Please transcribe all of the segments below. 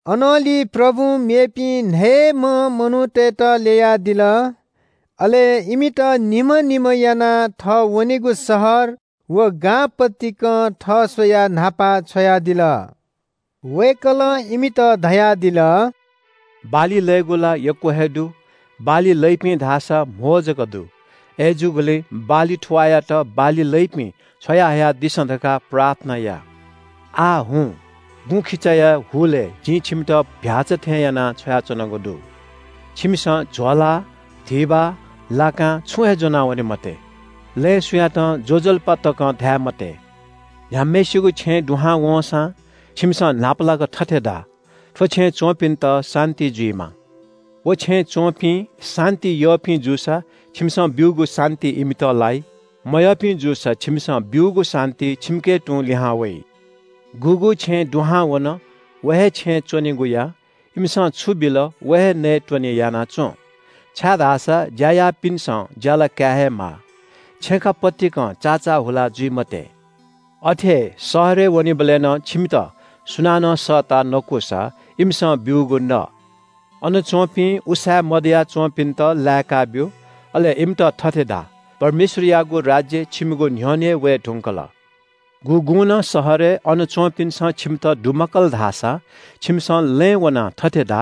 अनंलि प्रभुं मेपिं न्‍हयेम्‍ह मनूतय्‌त ल्‍ययादिल। अले इमित निम्‍ह निम्‍ह यानाः थः वनेगु शहर व गां पतिकं थः स्‍वयाः न्‍हापा छ्वयादिल। वय्‌कलं इमित धयादिल – “बाली लयेगु ला यक्‍व हे दु, बाली लइपिं धाःसा कम जक दु। अय्‌जूगुलिं बाली थुवाःयात बाली लइपिं छ्वयाहयादिसँ धकाः प्रार्थना या। आः हुँ, गुँखिचाया हुलय् जिं छिमित चीधिकःम्‍ह भ्‍याःचा थें यानाः छ्वयाच्‍वनागु दु। छिमिसं म्‍हिचा, धिबा, लाकां छुं हे ज्‍वनावने मते। लँय् सुयातं ज्‍वजलपा तकं धाये मते। “न्‍ह्याम्‍हय्‌सिगु छेँय् दुहां वंसां छिमिसं न्‍हापालाक थथे धा – ‘थ्‍व छेँय् च्‍वंपिन्‍त शान्‍ति जुइमा।’ व छेँय् च्‍वंपिं शान्‍ति यःपिं जूसा छिमिसं ब्‍यूगु शान्‍ति इमित लाइ। मयःपिं जूसा छिमिसं ब्‍यूगु शान्‍ति छिमिके तुं लिहां वइ। गुगु छेँय् दुहां वन, व हे छेँय् च्‍वनेगु या। इमिसं छु बिल व हे नयेत्‍वने याना च्‍वँ, छाय्‌धाःसा ज्‍या याःपिन्‍सं ज्‍याला काये हे माः। छेँखा पतिकं चाचाः हुला जुइ मते। “अथे हे शहरय् वनेबलय् नं छिमित सुनानं सःताः नकूसा इमिसं ब्‍यूगु न। अन च्‍वंपिं उसाँय् मदया च्‍वंपिन्‍त लाय्‌काब्‍यु। अले इमित थथे धा – ‘परमेश्‍वरयागु राज्‍य छिमिगु न्‍ह्यःने वये धुंकल।’ गुगुं नं शहरय् अन च्‍वंपिन्‍सं छिमित दुमकाल धाःसा छिमिसं लँय् वनाः थथे धा –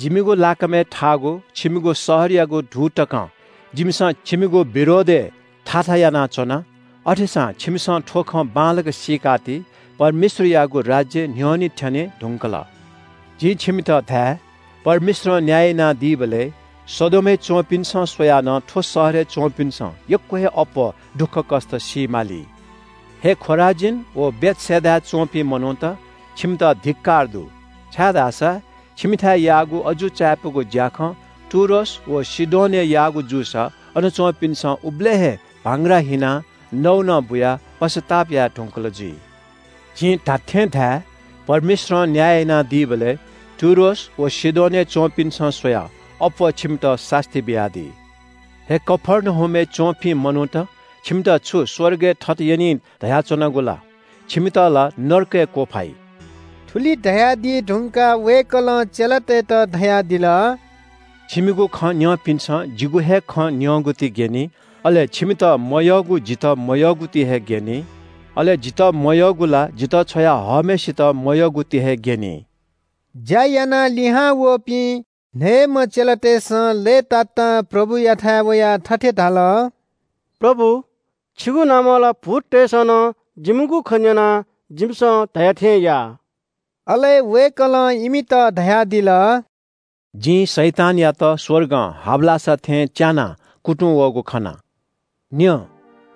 ‘जिमिगु लाकामय् थाःगु छिमिगु शहरयागु धू तकं जिमिसं छिमिगु विरोधय् थाथा यानाच्‍वना। अथेसां छिमिसं थ्‍व खँ बांलाक सीकाति – परमेश्‍वरयागु राज्‍य न्‍ह्यःने थ्‍यने धुंकल।’ जिं छिमित धाये – परमेश्‍वरं न्‍याय यानादीबलय् सदोमय् च्‍वंपिन्‍सं स्‍वयाः नं थ्‍व शहरय् च्‍वंपिन्‍सं यक्‍व हे अप्‍वः दुःखकष्‍ट सी माली।” “हे खोराजीन व बेथसेदाय् च्‍वंपिं मनूत, छिमित धिक्‍कार दु, छाय्‌धाःसा छिमिथाय् याःगु अजू चायापुगु ज्‍याखँ टुरोस व सीदोनय् याःगु जूसा अन च्‍वंपिन्‍सं उबलय् हे भांग्रा हिनाः नौनं बुयाः पश्‍चाताप याये धुंकल जुइ। जिं धात्‍थें धाये – परमेश्‍वरं न्‍याय यानादीबलय् टुरोस व सीदोनय् च्‍वंपिन्‍त स्‍वयाः अप्‍वः छिमित सास्‍ती बियादी। ‘हे कफर्नहुमय् च्‍वंपिं मनूत, छिमित छु स्‍वर्गय् थत यनी धयाच्‍वनागु ला? छिमित ला नरकय् क्‍वफाइ।’” थुलि धयादी धुंकाः वय्‌कलं चेलातय्‌त धयादिल – “छिमिगु खँ न्‍यंपिन्‍सं जिगु हे खँ न्‍यंगुति ग्‍यनी। अले छिमित मयःगु जितः मयःगुति हे ग्‍यनी। अले जितः मयःगु ला जितः छ्वया हःम्‍हय्‌सित मयःगुति हे ग्‍यनी।” ज्‍या यानाः लिहांवःपिं न्‍हयेम्‍ह चेलातय्‌सं लय्‌तातां प्रभुयाथाय् वयाः थथे धाल – “प्रभु, छिगु नामं ला भूततय्‌सं नं जिमिगु खँ न्‍यनाः जिमिसं धया थें याः।” अले वय्‌कलं इमित धयादिल – “जिं शैतानयात स्‍वर्गं हाबलासा थें च्‍यानाः कुतुं वःगु खना। न्‍यँ,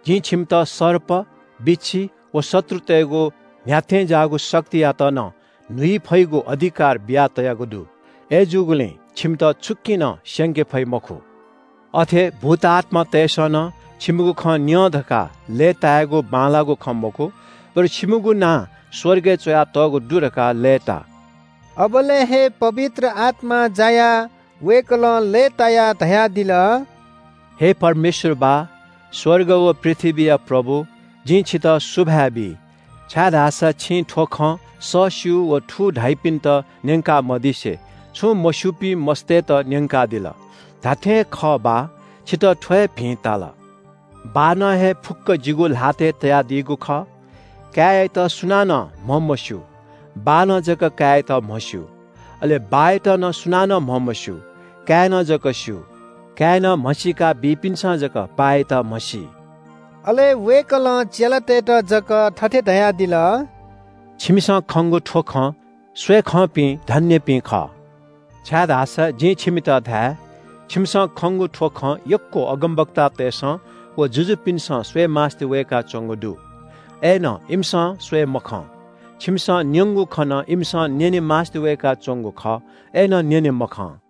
जिं छिमित सर्प, बिच्‍छी व शत्रुतय्‌गु न्‍ह्याथें ज्‍याःगु शक्तियात नं न्‍हुइ फइगु अधिकार बियातयागु दु। अय्‌जूगुलिं छिमित छुकिं नं स्‍यंके फइ मखु। अथे भूत आत्‍मातय्‌सं नं छिमिगु खँ न्‍यं धकाः लय्‌तायेगु बांलाःगु खँ मखु, बरु छिमिगु नां स्‍वर्गय् च्‍वयातःगु दु धकाः लय्‌ता।” अबलय् हे पवित्र आत्‍मां जायाः वय्‌कलं लय्‌तायाः धयादिल – “हे परमेश्‍वर बाः, स्‍वर्ग व पृथ्‍वीया प्रभु, जिं छितः सुभाय् बी, छाय्‌धाःसा छिं थ्‍व खँ सःस्‍यू व थू धाइपिन्‍त न्‍यंका मदिसे छुं मस्‍यूपिं मस्‍तय्‌त न्‍यंकादिल। धात्‍थें हे खः बाः, छितः थ्‍व हे भिं ताल।” “बाःनं हे फुक्‍क जिगु ल्‍हातय् तयादीगु खः। काय्‌यात सुनानं म्‍हमस्‍यू। बाःनं जक काय्‌यात म्‍हस्‍यू। अले बाःयात नं सुनानं म्‍हमस्‍यू, काय्‌नं जक स्‍यू। काय्‌नं म्‍हसीका बीपिन्‍सं जक बाःयात म्‍हसी।” अले वय्‌कलं चेलातय्‌त जक थथे धयादिल – “छिमिसं खंगु थ्‍व खँ स्‍वयेखंपिं धन्‍यपिं खः, छाय्‌धाःसा जिं छिमित धाये – छिमिसं खंगु थ्‍व खँ यक्‍व अगमवक्तातय्‌सं व जुजुपिन्‍सं स्‍वयेमास्‍ति वय्‌काच्‍वंगु दु, अय्‌नं इमिसं स्‍वये मखं। छिमिसं न्‍यंगु खँ नं इमिसं न्‍यने मास्‍ति वय्‌काच्‍वंगु खः, अय्‌नं न्‍यने मखं।”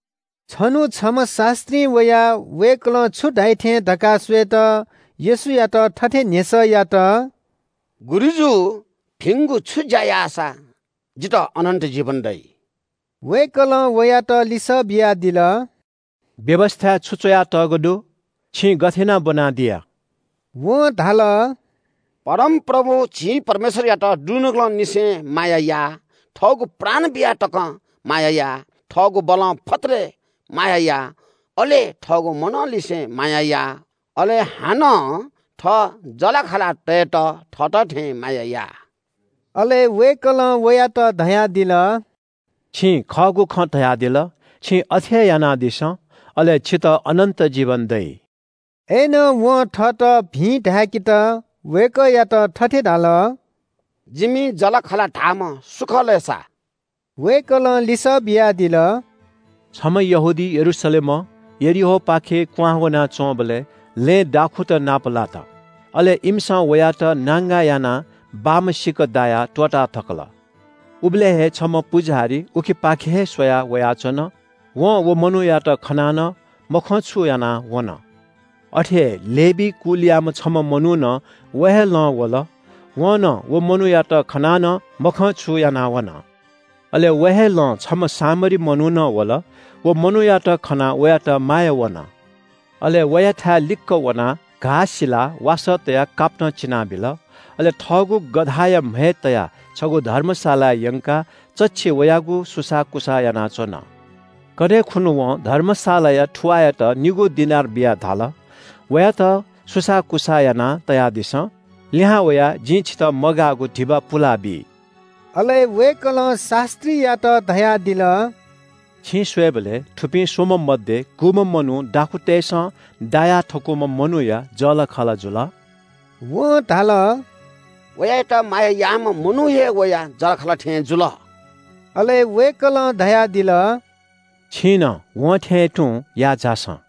छन्‍हु छम्‍ह शास्‍त्रीं वयाः वय्‌कलं छु धाइ थें धकाः स्‍वयेत येशूयात थथे न्‍ह्यसः यात – “गुरुजु, भिंगु छु ज्‍या याःसा जितः अनन्‍त जीवन दइ?” वय्‌कलं वयात लिसः बियादिल – “व्‍यवस्‍थाय् छु च्‍वयातःगु दु? छिं गथे यानाः ब्‍वनादिया?” वं धाल – “परमप्रभु झी परमेश्‍वरयात दुनुगलंनिसें माया या, थःगु प्राण बिया तकं माया या, थःगु बलं फत्तले माया या, अले थःगु मनंनिसें माया या। अले हानं थः जःलाखःलातय्‌त थःत थें माया या।” अले वय्‌कलं वयात धयादिल – “छिं खःगु खँ धयादिल। छिं अथे हे यानादिसँ, अले छितः अनन्‍त जीवन दइ।” अय्‌नं वं थःत भिं धाय्‌केत वय्‌कःयात थथे धाल – “जिमि जःलाखःला धाःम्‍ह सु खः लय् सा?” वय्‌कलं लिसः बियादिल – “छम्‍ह यहूदी यरूशलेमं यरीहोपाखे क्‍वहां वनाच्‍वंबलय् लँय् दाखुँत नापलात। अले इमिसं वयात नांगा यानाः बाम्‍ह सिक दायाः त्‍वःताथकल। “उबलय् हे छम्‍ह पुजाहारी उखेपाखे हे स्‍वयाः वयाच्‍वन। वं व मनूयात खनाः नं मखंछु यानाः वन। अथे हे लेवी कुलयाम्‍ह छम्‍ह मनू नं व हे लं वल। वं नं व मनूयात खनाः नं मखंछु यानाः वन। “अले व हे लं छम्‍ह सामरी मनू नं वल। व मनूयात खनाः वयात माया वन। अले वयाथाय् लिक्‍क वनाः घाः सिलाः वासः तयाः कापतं चिनाबिल। अले थःगु गधाया म्‍हय् तयाः छगू धर्मशालाय् यंकाः चच्‍छि वयागु सुसाःकुसाः यानाच्‍वन। कन्‍हय् खुन्‍हु वं धर्मशालाया थुवाःयात निगू दिनार बियाः धाल – ‘वयात सुसाःकुसाः यानातयादिसँ। लिहां वयाः जिं छितः मगाःगु धिबा पुलाबी।’” अले वय्‌कलं शास्‍त्रीयात धयादिल – “छिं स्‍वयेबलय् थुपिं स्‍वम्‍ह मध्‍ये गुम्‍ह मनू दाखुँतय्‌सं दाया थकूम्‍ह मनूया जःलाखःला जुल?” वं धाल – “वयात माया याःम्‍ह मनू हे वया जःलाखःला थें जुल।” अले वय्‌कलं धयादिल – “छिं नं वं थें तुं याः झासँ।”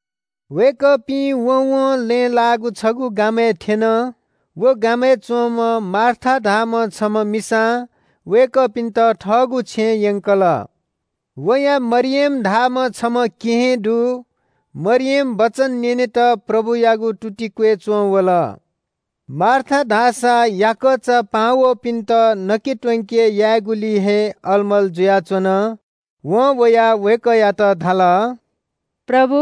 वय्‌कःपिं वँवं लँय् लाःगु छगू गामय् थ्‍यन। व गामय् च्‍वंम्‍ह मार्था धाःम्‍ह छम्‍ह मिसां वय्‌कःपिन्‍त थःगु छेँय् यंकल। वया मरियम धाःम्‍ह छम्‍ह केहेँ दु। मरियम वचन न्‍यनेत प्रभुयागु तुति क्‍वय् च्‍वंवल। मार्था धाःसा याकःचा पाहां वःपिन्‍त नके त्‍वंके यायेगुलिइ हे अलमल जुयाच्‍वन। वं वयाः वय्‌कःयात धाल – “प्रभु,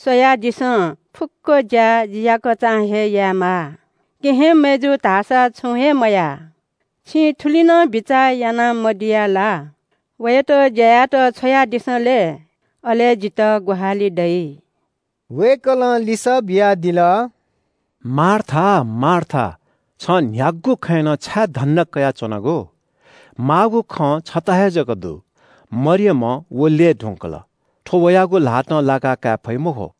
स्‍वयादिसँ, फुक्‍क ज्‍या जि याकःचां हे यायेमाः। केहेँ मय्‌जुं धाःसा छुं हे मया। छिं थुलि नं बिचाः याना मदिया ला? वयात ज्‍या यायेत छ्वयादिसँ लय्, अले जितः ग्‍वाहालि दइ।” वय्‌कलं लिसः बियादिल – “मार्था, मार्था, छं न्‍ह्यागु खँय् नं छाय् धन्‍दा कयाच्‍वनागु? माःगु खँ छता हे जक दु। मरियमं व ल्‍यये धुंकल। थ्‍व वयागु ल्‍हातं लाकाकाये फइ मखु।”